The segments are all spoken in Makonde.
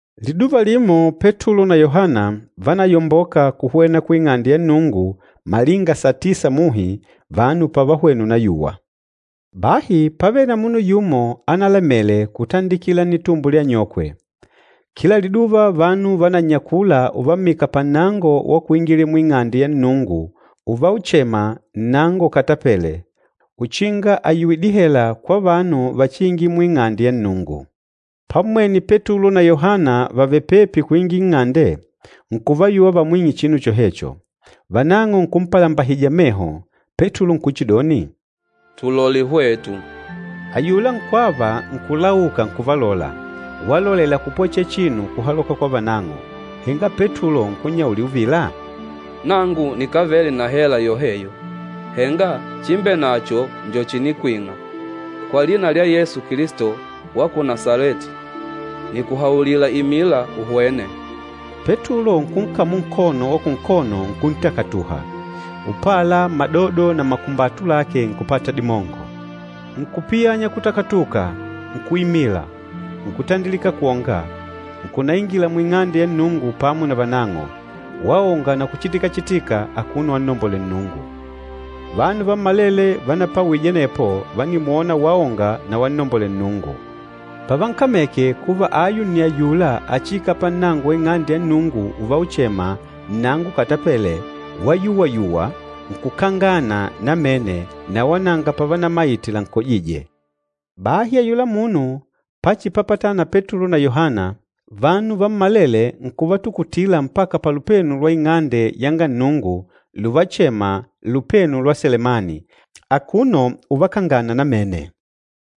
Liduva limo Petulo na Yohana vánayomboka kuhwena ku Ing'ande ya Nnungu malinga satisa muhi, vanu pavahwena unayuwa. Bahi pávele na munu yumo analamele kutandikila nnitumbo lya anyokwe. Kila liduva vanu vanannyakula uvammika pannango wa kuingilila mu Ing'ande ya Nnungu uvauchema, “Nnango Ukatapele,” uchinga ayuwe dihela kwa vanu vachiingila mu Ing'ande ya Nnungu. Pammwene Petulo na Yohana vàvele pepi kuingila nng'ande, nkuvayuwa vamwing'e chinu chohecho. Vanang'o nkumpalambahija meho, Petulo nkuchidoni, “Tulole hwetu!” Ayula nkwava nkulauka nkuvalola, walolela kupwechelela chinu kuhaloka kwa vanang'o. Henga Petulo nkunnyaulila uvila, “Nangu nikávele na hela yoheyo, henga chimbenacho njo chinikwing'a. Kwa lina lya Yesu Kilisto wa ku Nasaleti, nikuhaulila imila uhwene!” Petulo nkunkamula nkono wa kunkono nkuntakatuha, upala madodo na makumbatu lake nkupata dimongo. Nkupiyanya kutakatuka, nkuimila, nkutandilika kwonga, nkunaingila mu Ing'ande ya Nnungu pamo na vanang'o, waonga na kuchitikachitika akuno wannombolela Nnungu. Vanu vammalele vanapawije anepo vánimwona waonga na wannombolela Nnungu. Pavankameke kuva ayu nni ayula achiikala pannango wa Ing'ande ya Nnungu uvauchema, “Nnango Ukatapele,” wayuwayuwa nkukangana namene na wala nanga pavanamaite lankojîje. Bahi ayula munu pachipapatana na Petulo na Yohana, vanu vammalele nkuvatukutila mpaka palupenu lwa Ing'ande yanga Nnungu luvachema, “Lupenu lwa Selemani,” akuno uvakangana namene.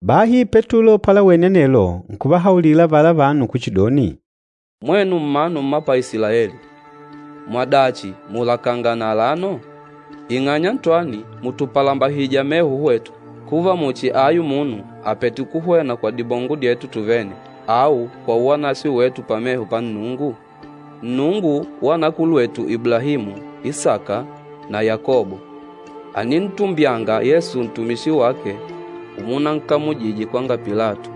Bahi Petulo palawene anelo nkuvahaulila avala vanu kuchidoni, “Mwenu mmanu mma pa Isilaeli, mwadachi mùlakangana alano? Ing'anya ntwani mùtupalambahija meho hwetu, kuva muchi ayu munu àpete kuhwena kwa dimongo dyetu tuvene au kwa uwanaswe wetu pameho pa Nnungu? Nnungu wa anakulwetu Iblahimu, Isaka na Yakobo, ànintumbyanga Yesu ntumishi wake umunankamujije kwanga Pilato,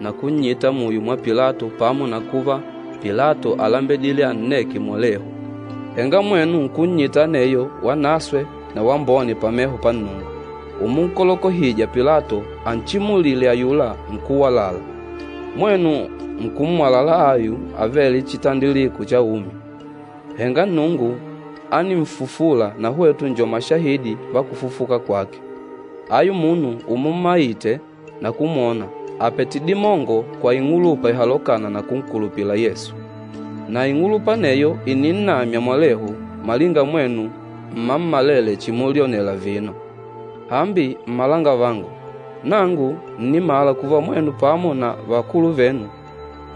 na kunnyita muyo mwa Pilato pamo na kuva Pilato álembedile anneke mwalehu. Henga mwenu nkunnyita aneyo wanaswe na wambone pameho pa Nnungu, umunkolokohija Pilato anchimulile ayula nkúwalala. Mwenu nkummwalala ayu anavele chitandikilo cha umi. Henga Nnungu áninfufula, na hwetu njo mashahidi va kufufuka kwake. Ayu munu umummayite na kumwona, àpete dimongo kwa ing'ulupa ihalokâna na kunkulupila Yesu. Na ing'ulupa aneyo ìninnamya mwalehu malinga mwenu mmammalele chimulyonela vino. Hambi mmalangavangu, nangu ǹnimala kuva mwenu pamo na vakulu venu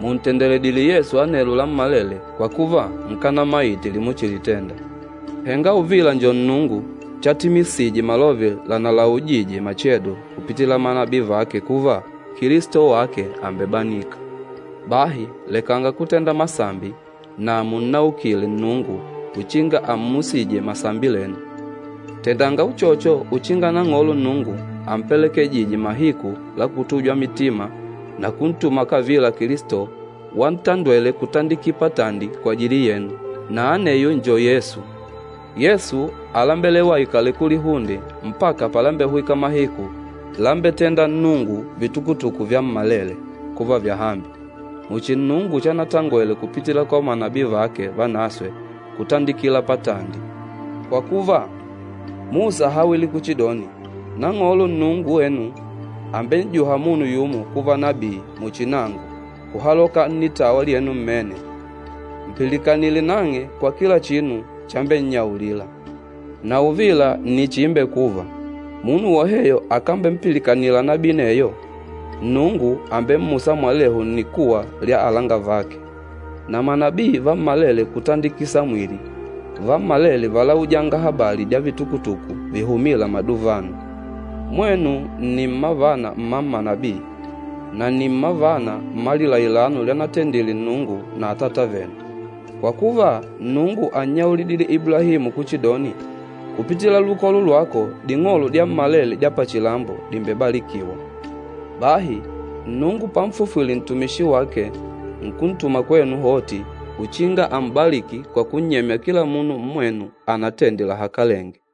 mùntendeledile Yesu anelo lammalele kwa kuva nkanamaite limuchilitenda. Henga uvila njo Nnungu chatimisije malove lanalaujije machedo kupitila manabii vake kuva, Kilisto wake àmbebanika. Bahi lekanga kutenda masambi, na munnaukile Nnungu uchinga ammusije masambi lenu. Tendanga uchocho uchinga Nang'olo Nnungu ampelekejije mahiku la kutujwa mitima na kuntuma kavila Kilisto wantandwele kutandiki patandi kwajili yenu, na aneyo njo Yesu. Yesu álembelewa aikale kulihunde mpaka palambehwika mahiku lambetenda Nnungu vitukutuku vyammalele kuva vyahambi, muchi Nnungu chanatangwele kupitila kwa manabii vake vanaswe kutandikila patandi. Kwa kuva, Musa áhawile kuchidoni, ‘Nang'olo Nnungu wenu àmben'juha munu yumo kuva nabii muchi nangu kuhaloka nnitawa lyenu mmene. Mpilikanile nang'e kwa kila chinu chambennyaulila. Na uvila nni chiimbekuva, munu woheyo akambempilikanila nabii aneyo, Nnungu àmbemmusa mwalehu nnikuwa lya alangavake.’ Na manabii vammalele kutandiki Samwili, vammalele válaujanga habali dya vitukutuku vihumîla maduvano. Mwenu nni mmavana mma manabii, na nni mmavana mma lilailano lyanatendile Nnungu na atata venu. Kwa kuva, Nnungu ánnyaulidile Iblahimu kuchidoni, ‘Kupitila lukolo lwako, ding'olo dyammalele dya pachilambo dìmbebalikiwa.’ Bahi Nnungu panfufwile ntumishi wake, nkuntuma kwenu hoti uchinga ám'balìkì kwa kunnyemya kila munu mmwenu anatende lahakalenge.”